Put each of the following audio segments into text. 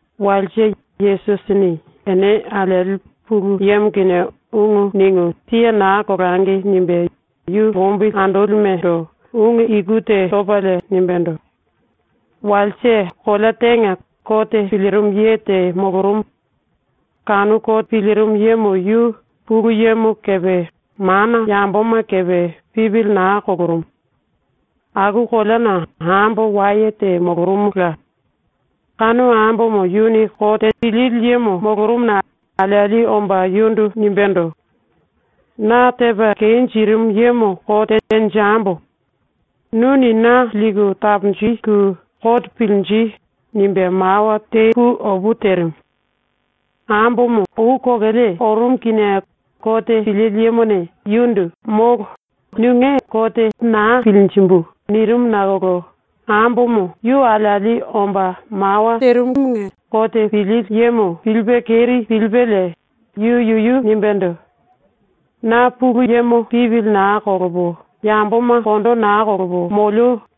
Walse, Yesusini ‘Ene alieli Pulu Yemo kinie ungu ningu siye naa kolangi.’ nimbe yu lombili andolimendo ungu iku te topalie nimbendo: “Walse, kolea tenga kote pilirimu ye te molorumu. Kanu kote pilirimu yemo yu Pulu Yemo kepe mana yamboma kepe, pipili naa kolorumu. Aku koleana ambo waye te molorumula. Kanu ambomo yuni kote pilili yemo molorumuna alieli omba yundu nimbendo: “Na tepa kenjirimu yemo kote tenjembo. Nuni na liku taponjiku kote pilinji.” nimbe mawa te pu opu terimu. Ambomo ou kokele orumu kinie kote pilili yemone yundu “Molo, nunge kote naa pilinjimbu.” nirimu nakolo ambomo yu alieli omba mawa terimumunge kote pilili yemo pilipe keri pilipelie yu yuyu nimbendo: ‘Na Pulu Yemo pipili naa kolopo, yamboma kondo naa kolopo molio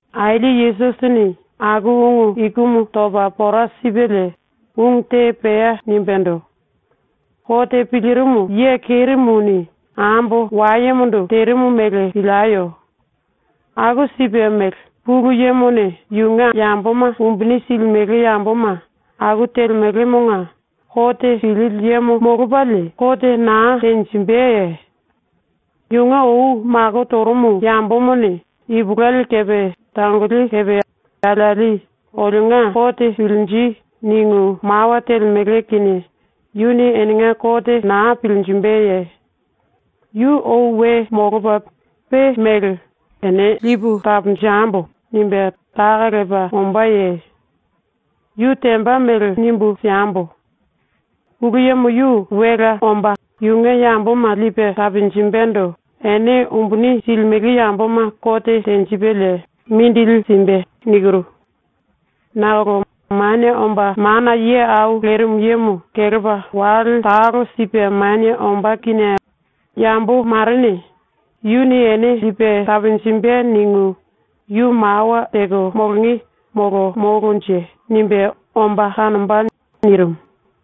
Aili ⸤Yesusini aku ungu ikumu topa pora sipelie⸥ ungu te pea nimbendo: “Kote pilirimu ye kerimuni ambo wayemondo terimu mele pilieyo. Aku sipe mele Pulu Yemone yunge yamboma umbuni silimele yamboma aku telemelemonga kote pilili yemo molopalie kote naa tenjimbeye? Yunge ou mako torumu yambomane ipulueli kepe tangoli kepe alieli “Olionga kote pilinji.” ningu mawa telemele kinie yuni enenga kote naa pilinjimbeye? Yu ou we molopa pe mele “Ene lipu taponjembo.” nimbe taka lepa ombáye? Yu temba mele nimbu siembo: Pulu Yemo yu welea omba yunge yamboma lipe taponjimbendo, ene umbuni silimele yamboma kote tenjipelie mindili simbe. Nakolo Manie Omba Mana Ye Au Lerimu Yemo kelepa wale talo sipe manie ombá kinie “Yambo marene ‘Yuni ene lipe taponjimbe.’ ningu yu mawa teko molonge molo molonje?” nimbe omba kanomba.” nirimu.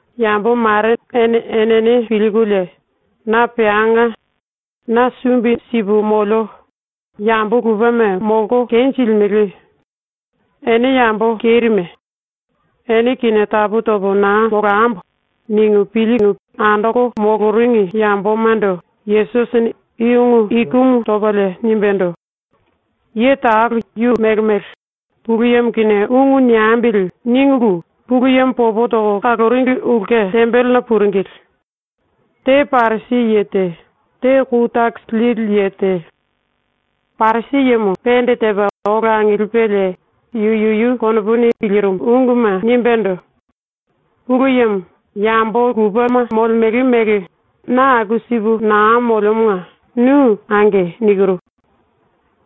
Yambo mare ene enene pilkulie ‘Na peanga. Na sumbi sipu molio, yambo lupema molko kenjilimele. Ene yambo kerime. Ene kinie tapu topo naa molambo.’ ningu pilku andoko moloringi yambomando Yesusini i ungu ikumu topalie nimbendo: “Ye talo yu mele mele ‘Pulu Yemo kinie ungu niembili.’ ningulu Pulu Yemo popo toko kaloringi ulke tembelena puringili. Te Parisi ye te, te kou takisi lili ye te. Parisi yemo pende tepa ola angilipelie yu yuyu konopuni pilirimu unguma nimbendo: “Pulu Yemo, yambo lupe molemele mele na aku sipu naa moliomonga nu “Ange.” nikiru.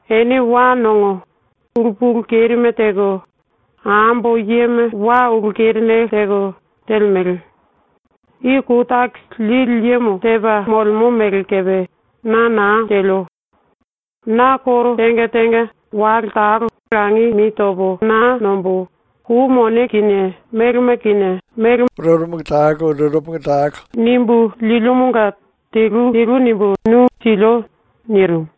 Ene wa nongo, ulu pulu kerime teko, ambo yema wa ulu kerinele teko, telemele. I kou takisi lili yemo tepa molemo mele kepe na naa telio. Na koro tenga tenga wale talo langi mi topo naa nombo, kou mone kinie melema kinie mele tene tene nimbu liomanga telu telu nimbu nu silio.” nirimu.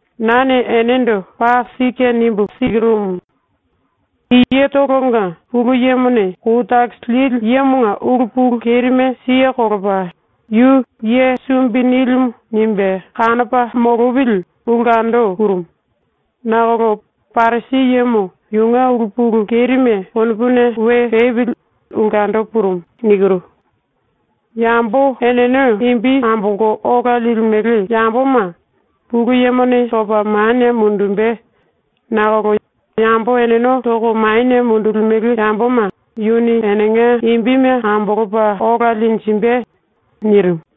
“Nane enendo paa sike nimbu sikirumu: I yetolonga Pulu Yemone kou takisi lili yemonga ulu pulu kerime siye kolopa, yu ‘ye sumbi nilimu.’ nimbe kanopa molopili ulkendo purumu, nakolo Parisi yemo yunge ulu pulu kerime konopuna we pepili ulkendo purumu. Yambo eneno imbi ambolko ola limele yamboma Pulu Yemone topa manie mundumbe, nakolo yambo eneno toko manie mundulimele yamboma yuni enenga imbime ambolopa ola linjimbe.” nirimu.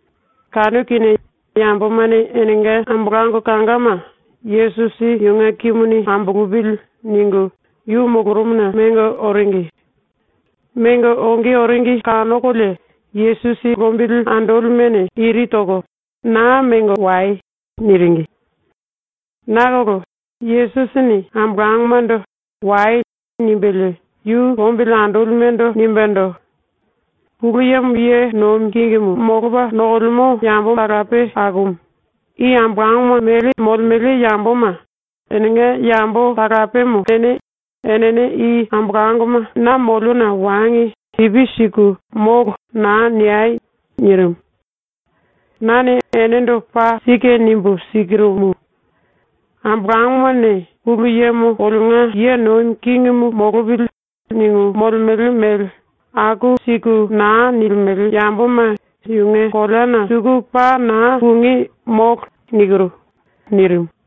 Kanu kinie yambomane enenga ambolango kangama ‘Yesusi yunge kimuni ambolopili.’ ningu yu molorumuna mengo oringi. Mengo onge oringi kanokolie Yesusi lombili andolimene iri toko ⸤“Naa mengo wai.”⸥ niringi. Nakolo Yesusini ambolangomando “Wai.” nimbelie ⸤yu lombili andolimendo⸥ nimbendo: “Pulu Yemo ye nomi kingimu molopa nokolemo yambo talape akumu i ambolangoma mele molemele yamboma enenga yambo talapemo kene enene i ambolangoma na moliona wangi pipi siku “Molo.” naa niei.” ⸤nirimu.⸥ “Nane enendo paa sike nimbu sikirumu: Ambolangomane ‘Pulu Yemo olionga ye nomi kingimu molopili.’ ningu molemele mele aku siku naa nilimele yamboma yunge koleana suku paa naa pungí, molo.” nirimu.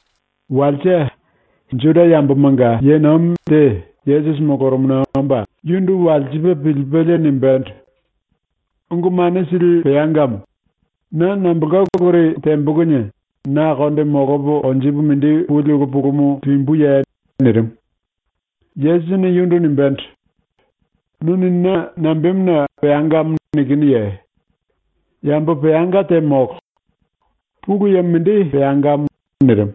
⸤Walse⸥ ⸤Juda yambomanga⸥ ye nomi te Yesusi molorumuna omba yundu walsipe pilipelie nimbendo: “Ungu Mane Sili Peangamo, na nambolka uluri tembo kinie na konde molopa konjipe mindi puli ulu pulumu limbuye?” nirimu. Yesusini yundu nimbendo: “Nuni na nambemuna “Peangamo.” nikinuye? Yambo peanga te molo. Pulu Yemo mindi peangamo.” ⸤nirimu.⸥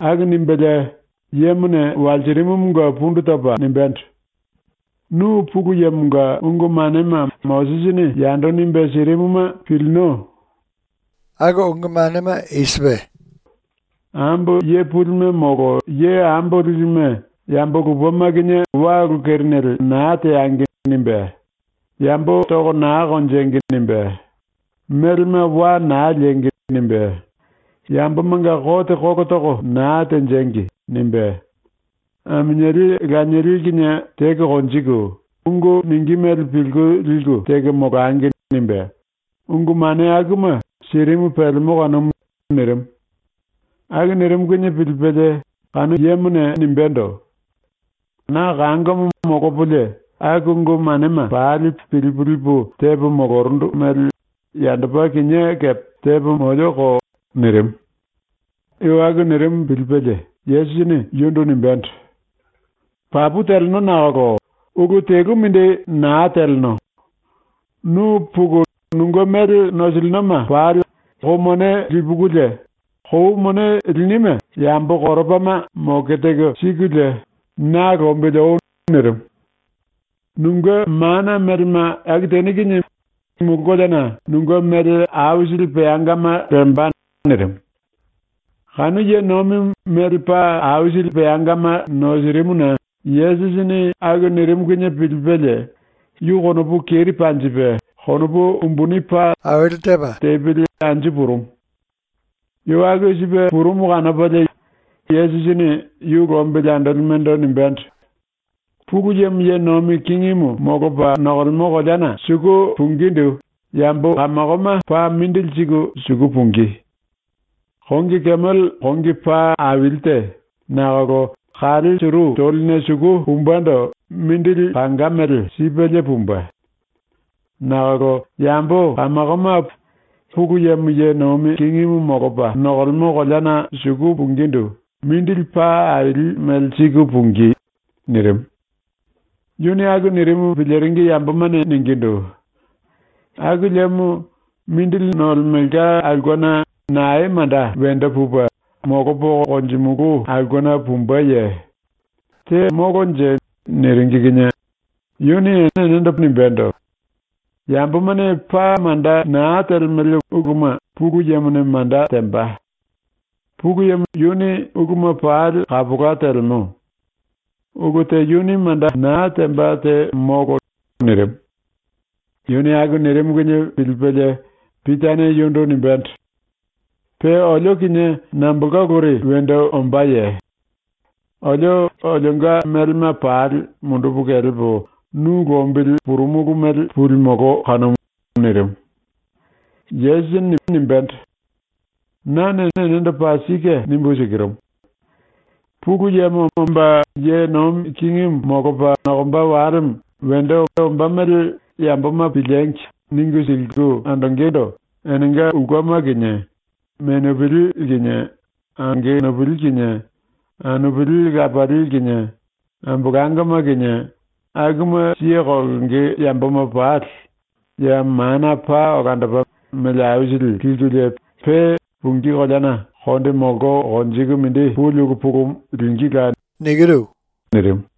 ⸤Aku nimbelie yemone walsirimumunge pundu topa nimbendo:⸥ “Nu ⸤Pulu Yemonga⸥ ungu manema ⸤Mosisini yando nimbe sirimuma⸥ pilino. Yuni nimbendo: “Ambo ye pulime molo ye ambo lilime yambo lupema kinie wa ulu kerinele naa teangi.” nimbe, “Yambo toko naa konjengi.” nimbe, “Melema wa naa liengi.” nimbe, “Yambomanga kote kolo toko naa tenjengi.” nimbe, “Aminieli lanieli kinie teko konjiku, ungu ningí mele pilku liku teko molangi.” nimbe, ungu mane akuma sirimu pelemo kanumu.” nirimu. Aku nirimu kinie pilipelie kanu yemone nimbendo: “Na kangomo molopolie aku ungu manema pali pilipu lipu tepo molorundu mele yandopa kinié kepe tepo molioko.” nirimu. Yu aku nirimu pilipelie Yesusini yundu nimbendo: “Papu teleno nakolo ulu telu mindi naa teleno. Nu puku nunge mele nosilinoma pali kou mone lipukulie, kou mone linime yambo koropama moke teko sikulie na lombili oi.” nirimu. “Nunge ⸤mana⸥ melema aku teni kinie mulu koleana nunge mele aisili peangama lemba.” nirimu. Kanu ye nomimu mele paa aisili nosirimuna Yesusini aku nirimu kinie pilipelie yu konopu keri panjipe konopu umbuni paa tepili anju purumu. Yu aku sipe purumu kanopalie Yesusini yu lombili andolimendo nimbendo: “Pulu Yemo ye nomi kingimu molopa nokolemo koleana suku pungindu yambo kamakoma paa mindili siku suku pungí. Kongi kemele ⸤kongi paa aili te nakolo⸥ kale suru toline suku pumbendo mindili kanga mele sipelie pumbe. Nakolo yambo kamakoma Pulu Yemo ye nomi kingimu molopa nokolemo koleana suku pungindu mindili paa aili mele siku pungí.” nirimu. Yuni aku nirimu piliringi yambomane ningindu: “Aku liemo mindili nolemelka aulkena nae manda wendo pupe, molopo konjimulu aulkena pumbeye? Te molonje?” niringi kinie yuni enendo nimbendo: “Yambomane paa manda naa telemele uluma Pulu Yemone manda temba. Pulu Yemo yuni uluma pali kapola telemo. Ulu te yuni manda naa temba te molo.” nirimu. ⸤Yuni aku nirimu kinie pilipelie⸥ Pitane yundu nimbendo: “⸤Pe olio kinie nambolka uluri wendo ombáye?⸥ Olio olionga melema pali mundupu kelepo nu lombili purumulu mele pulimolo kanumu.” nirimu. Yesusini nimbendo: “Nane enendo paa sike nimbu sikirumu: Pulu Yemo omba ye nomi kingimu molopa nokomba walemo wendo ombá mele ‘Yamboma piliengi!’ ningu siliku andongendo enenga ulkema kinie, menupili kinie, angenupili kinie, anupili lapali kinie, ambolangoma kinie, akuma siye kolonge yamboma pali ya mana paa olandopa mele aisili likulie pe pungí koleana konde molko konjiku mindi puli ulu pulumu lingíla.” nirimu.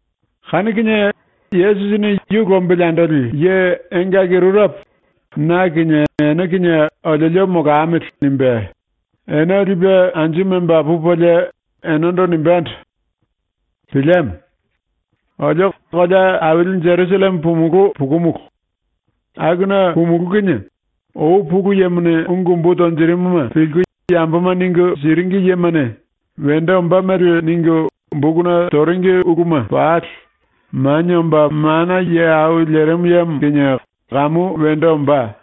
Kanu kinie Yesusini ⸤yu lombili andoli⸥ ye engaki rurepo ‘na kinie ene kinie oliolio molamili.’ nimbe ene lipe anju memba pupelie enendo nimbendo: “Pilieme. Olio kolea aili Jerusalleme pumulú pukumulu. Akuna pumulú kinie ou Pulu Yemone ungu umbu tonjirimuma pilku yamboma ningu siringi yemane wendo ombá mele ningu bokuna toringi uluma pali Manie Omba Mana Ye Au Lerimu Yemo kinie kamu wendo ombá.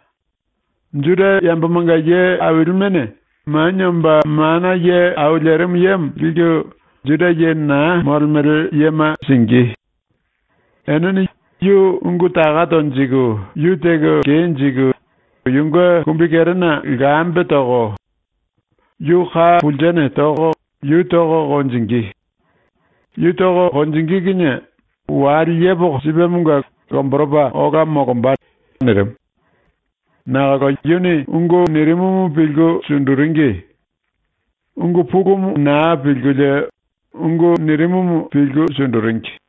Juda yambomanga ye ailimene Manie Omba Mana Ye Au Lerimu Yemo liku Juda ye naa molemele yema singí. Enene yu ungu taka tonjiku yu teko kenjiku yunge kumbikerena lkambe toko, yu ka pulsene toko yu toko konjingí. Yu toko konjingí kinie wale yepoko sipemonga lomboropa ola molomba.” nirimu. Nakolo yuni ungu nirimumu pilku sunduringi. Ungu pulumu naa pilkulie ungu nirimumu pilku sunduringi.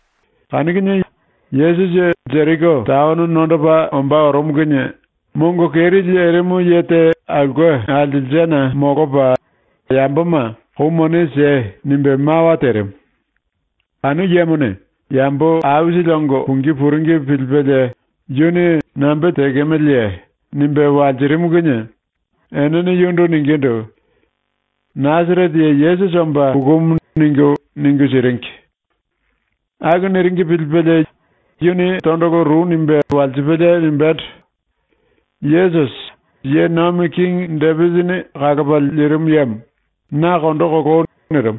Kanu kinie Yesusi Jeriko taono nondopa ombá orumu kinie mongo keri lerimu ye te aulke alselsena molopa yamboma “Kou mone siei.” nimbe mawa terimu. Kanu yemone yambo aisili ongo pungí puringi pilipelie yuni “Nambe tekemeleye?” nimbe walsirimu kinie enene yundu ningindu: “Nasarete ye Yesusi omba pukumu.” ningu, ningu siringi. Aku niringi pilipelie yuni tondolo ru nimbe walsipelie nimbendo: “Yesusi, ⸤ye nomi kingi⸥ Depisini kalopa lirimu yemo, na kondo koloi.” nirimu.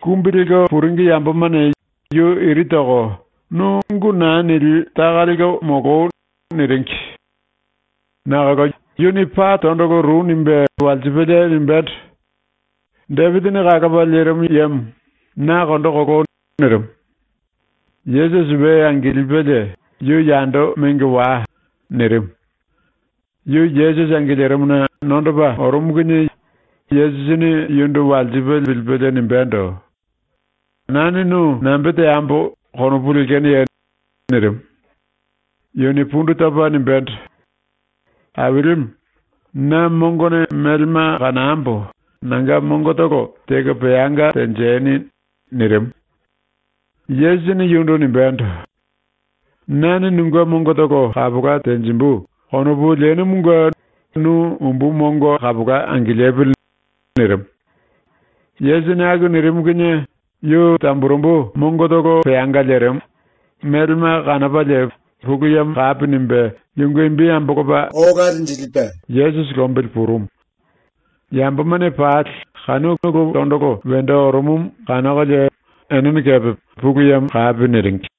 Kumbi lelko puringi yambomane yu iri toko “Nu ungu naa nili taka lelko moloi.” niringi. Nakolo yuni paa tondolo ru nimbe walsipelie nimbendo: “Depisini kalopa lirimu yemo, na kondo koloi.” nirimu. Yesusi we angilipelie “Yu yando mengo wai.” nirimu. Yu Yesusi angilirimuna nondopa orumu kinie Yesusini yundu walsipe pilipelie nimbendo: “Nane nu nambe teambo konopu lekenoye?” nirimu. Yuni pundu topa nimbendo: “Ailimu, na mongone melema kanambo nanga mongotolo teko peanga tenjeni.” nirimu. Yesusini yundu nimbendo: “‘Nane nunge mongotolo kapola tenjimbu.’ konopu lenumunge nu umbu mongo kapola angilipili.” nirimu. Yesusini aku nirimu kinie yu tamburembu mongotolo peanga lerimu, melema kanopalie Pulu Yemo kapi nimbe yunge imbi ambolopa ola linjilipe Yesusi lombili purumu. Yambomane pali kanu ulu ⸤tondolo wendo orumumu⸥ kanokolie enene kepe Pulu Yemo kapi niringi.